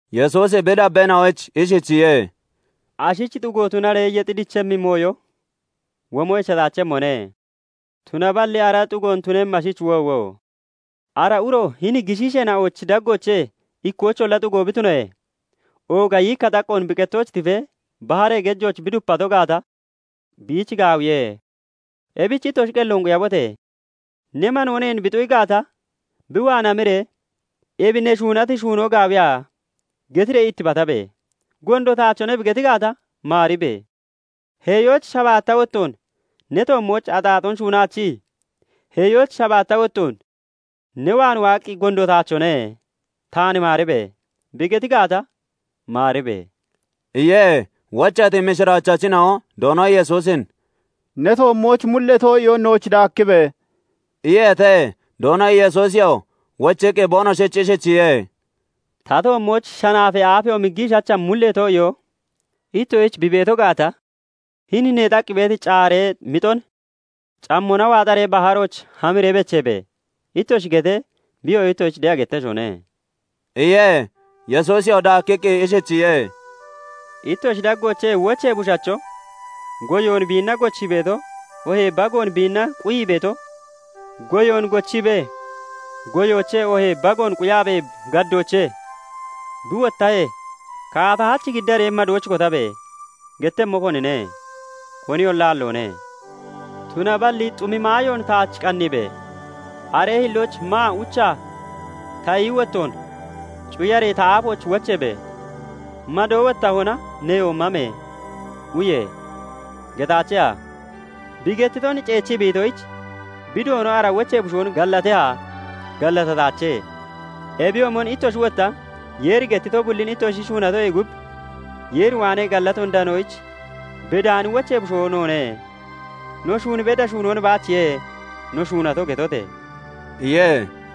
Yesuusi bi dabbeena'oyich ishichiye:- "Ashich xugo tunaree yexi dichemmi mooyo womo echataachemmone; tunaballi ara xuggoon tunemmi ashich woowo! Ara uro hini gishiisheena'ochi daggoochee ikkoyicholla xugo bi tunoyee, ooga yiikka xaqqoon bi qettooch tifee baharee gejooch bi dupato gaata, biich gaawiye. Ebich ittoshi qelloon quyabote! "Ne manoo neen bi xu'i gaata, bi waan hamiree 'Ebi ne shuunati shuunoo gaawiya?' getiree ittibatabe! 'Gondo taachone' bi geti gaata, maaribe! Heeyooch shabaatta wottoon ne toommooch axaaxoon shuunaachii, heeyooch shabaatta wottoon ne waan waaqqi, 'Gondo taachone; taan maaribe!' bi geti gaata, maaribe!" iye. Wocheeti mishiraachachina'o Doono Yesuusin "Ne toommooch mulee too'iyoon nooch daakkibe!" iyeete. Doono Yesuusiyoo wochiqqi boonoshich ishichiye:- "Ta toommooch shanaafee aafeyoomi giishacha mullee too'iyoo ittoshich bi beeto gaata, hini neexaqqi beeti caaree (canee) mixon 'Cammona waaxaree baharooch hamiree becheebe!' ittoshi getee, biyoo ittoshich de'a getteshone" iye. Yesuusiyoo daakkiqqi ishichiye:- "Ittoshi daggoochee wochee bushacho, goyoon biinna gochii beeto oohee bagoon biinna quyii beeto goyoon gochiibee goyoochee oohee bagoon quyaabee gaddoochee bi wottahee, 'Kaata hach giddaree madooch kotabe!' gettemmo konine? Koniyolla aalloone. Tunaballi 'Xumi maayoon taach qanniibe! Aree hillooch maa uchaa ta iyi wottoon cuyaree ta aafooch wocheebe! Mado wottahona neyo mame! uye!' getaacheha? Bi gettiton ceechii bi itoyich, bi doono ara wochee bushoon gallateha? Gallatataache! Ebiyoomon ittoshi wotta Yeeri gettito bullin ittoshi shuunatoyee gub, 'Yeer waanee gallatoon danoyich bedaani wochee bushoo noone; no shuun beda shuunoon baachiye no shuunato' getote!" iye.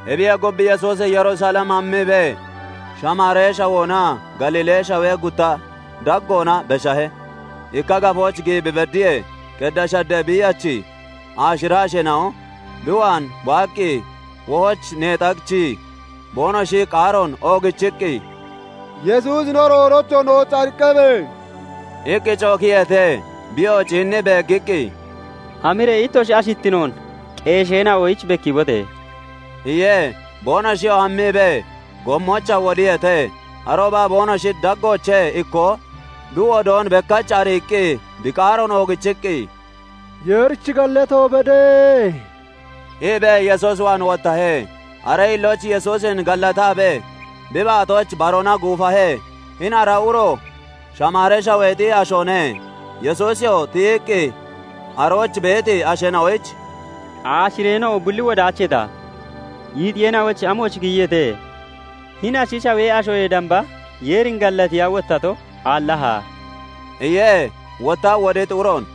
Ebiyee gub, Yesuusi Yerusalem hammiibee Shamaaree shawoonaa Galiilee shawee gutta daggoona beshahe. Ikka gafooch giyi bi beddiyee, qeddee shaddee biiyachi aashira asheena'o bi waan waaqqi wohooch neexaachii, boonoshi qaaroon oogichiqqi, "Yesuusi no Doonocho! Nooch ariqqabe!" iqqi cookiyeete. Biyoo ciinnii beeggiqqi, "Hamiree ittoshi ashittinoon qeesheena'oyich bekkiibote!" iye. Boonoshiyoo hammiibee, gommoochaa wodiyeete. Arooba boonoshi daggoochee ikkoo bi wodoon bekkach ariiqqi bi qaaroon oogichiqqi, "Yeerich gallato bede!" iibee Yesuus waan wottahe; Aree hillooch Yesuusin gallataabee bi baatooch baroona guufahe. Hini ara uroo Shamaaree Shaweexi ashoone. Yesuusiyoo tiyiqqi arooch beeti asheena'oyich "Aashireena'o bulli wodaacheeta? Yiixiyeena'ochi amooch giyiyeete? Hini ashi shawee ashoyee damba Yeerin gallatiya wottato aallaha?" iye. Wotta woditi uroon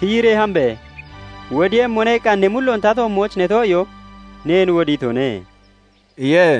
"Tiyiree hambe! 'Wodiiyemmone' iqqa ne mulloon ta toommooch ne too'iyoo neen wodiitone" iye.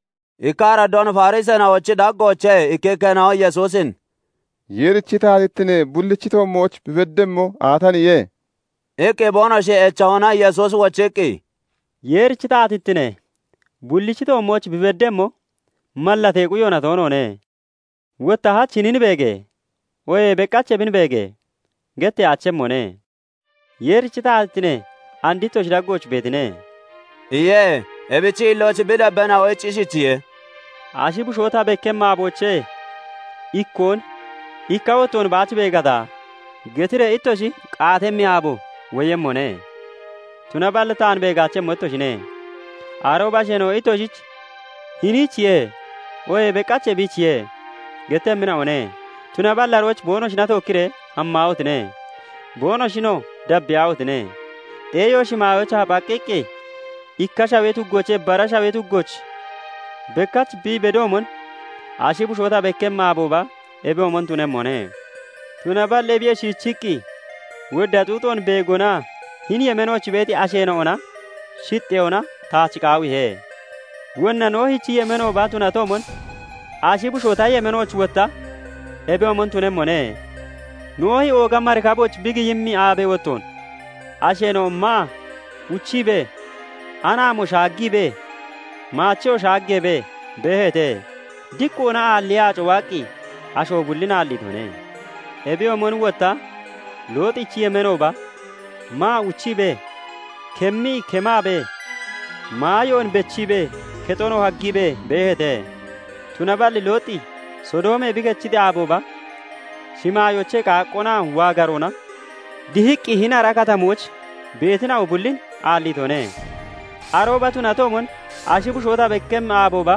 Ikka araddoon Fariseena'ochi daggoochee ikkikkeena'o Yesuusin "Yeerichi taatittine bullichi toommooch bi beddemmo aataniye?" iqqi boonoshi echahona, Yesuusi wochiqqi, "Yeerichi taatittine bullichi toommooch bi beddemmo mallatee quyoona toonoone; Wotta 'Hach hinin beege!' oohee 'Beqach ebin beege!' getteyaachemmone. Yeerichi taatittine and ittoshi daggooch beetine" iye. Ebichi hillooch bi dabbeena'oyich ishichiye:- "Ashi bushoo ta bekkemmi aaboochee ikkoon 'Ikka wottoonoo baach beegata!' getiree ittoshi Kaatemmi aabo woyemmone; tunaballi taan beegaachemmo ittoshine. Arooba asheena'o ittoshich 'Hiniichiye!' oohee 'Beqach ebiichiye!' gettemmina'one; tunaballi arooch boonoshina tookkiree hammaahotine! Boonoshinoo dabbiyaahotine! Xeeyo shimaayoochaa phaqqiqqi ikka shawee tuggoochee bara shawee tuggooch bekkach bi bedoomon, ashi bushoo ta bekkemmi aabooba ebiyoomon tunemmone. Tunaballi ebiyee shiichi wodda xuuxoon beegonaa hini yemeenooch beeti asheena'ona shixxeyoona taach qaawiihe. Wonna Noohichi yemeenooba tunatoomon, ashi bushoo ta yemeenooch wotta ebiyoomon tunemmone. Noohi ooga marikabooch bi giyemmi aabee wottoon, asheena'o maa uchiibee, anaamo shaaggiibee, maacheyoo shaaggeebee beeheete; diqqoona aalliyee aaco waaqqi asho bullin aalliitone. "Ebiyoomon wotta Looxichi yemeenooba, maa uchiibee, kemmii kemaabee, maayoon bechiibee, kexonoo haggiibee beeheete; Tunaballi Looxi Sodoomee bi kechiti aabooba shimaayoochee qaaqqoonaa waagaroona dihiqqi hini ara katamooch beetina'o bullin aalliitone. "Arooba tunatoomon ashi bushoo ta bekkemmi aabooba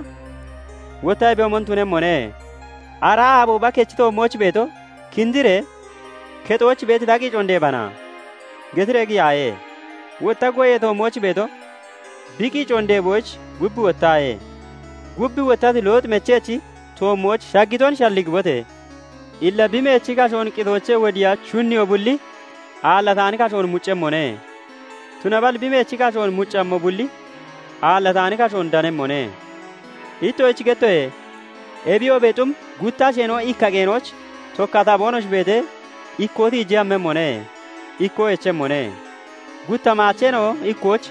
wotta ebiyoomon tunemmone. Ara aabooba kechi toommooch beeto 'Kindiree kexooch beeti ta qiicoon deebana!' getiree giyaaye! Wotta goyee toommooch beeto, bi qiicoon deeboyich gub wottaaye! Gub wottati Looxi mechechi toommooch shaggiton shalligibote! Illa bi meechi kashoon qitoochee wodiiya shunniyo bulli aallataani kashoon muccemmone; tunaballi bi meechi kashoon muccammo bulli aallataani kashoon danemmone. Ittoshich gettoye; ebiyoobee xum gutta asheena'o ikka qeenooch tokkata boonoshi beetee, ikkoo tiijee hammemmone; ikkoo echemmone. Gutta maacheena'o ikkooch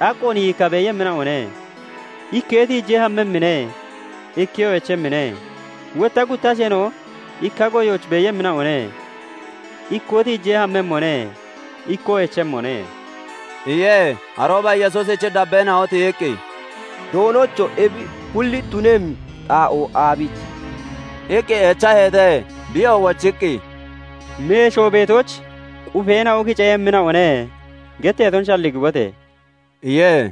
xaqqoon yiikka beeyemmina'one; ikkee tiijee hammemmine; ikkeyo echemmine[. Wotta gutta asheena'o ikka goyooch beeyemmina'one; ikkoo tiijee hammemmone; ikkoo echemmone]" iye. Arooba Yesuusichi dabbeena'o tiyiqqi, "Doonocho! Ebi bulli tunemmi xaa'oo aabichiye?" iqqi echaheete. Biyoo wochiqqi, " 'Meshoo beetooch qufeena'o (aakeena'o) kiceeyemmina'one' getteeton shalligibote!" iye.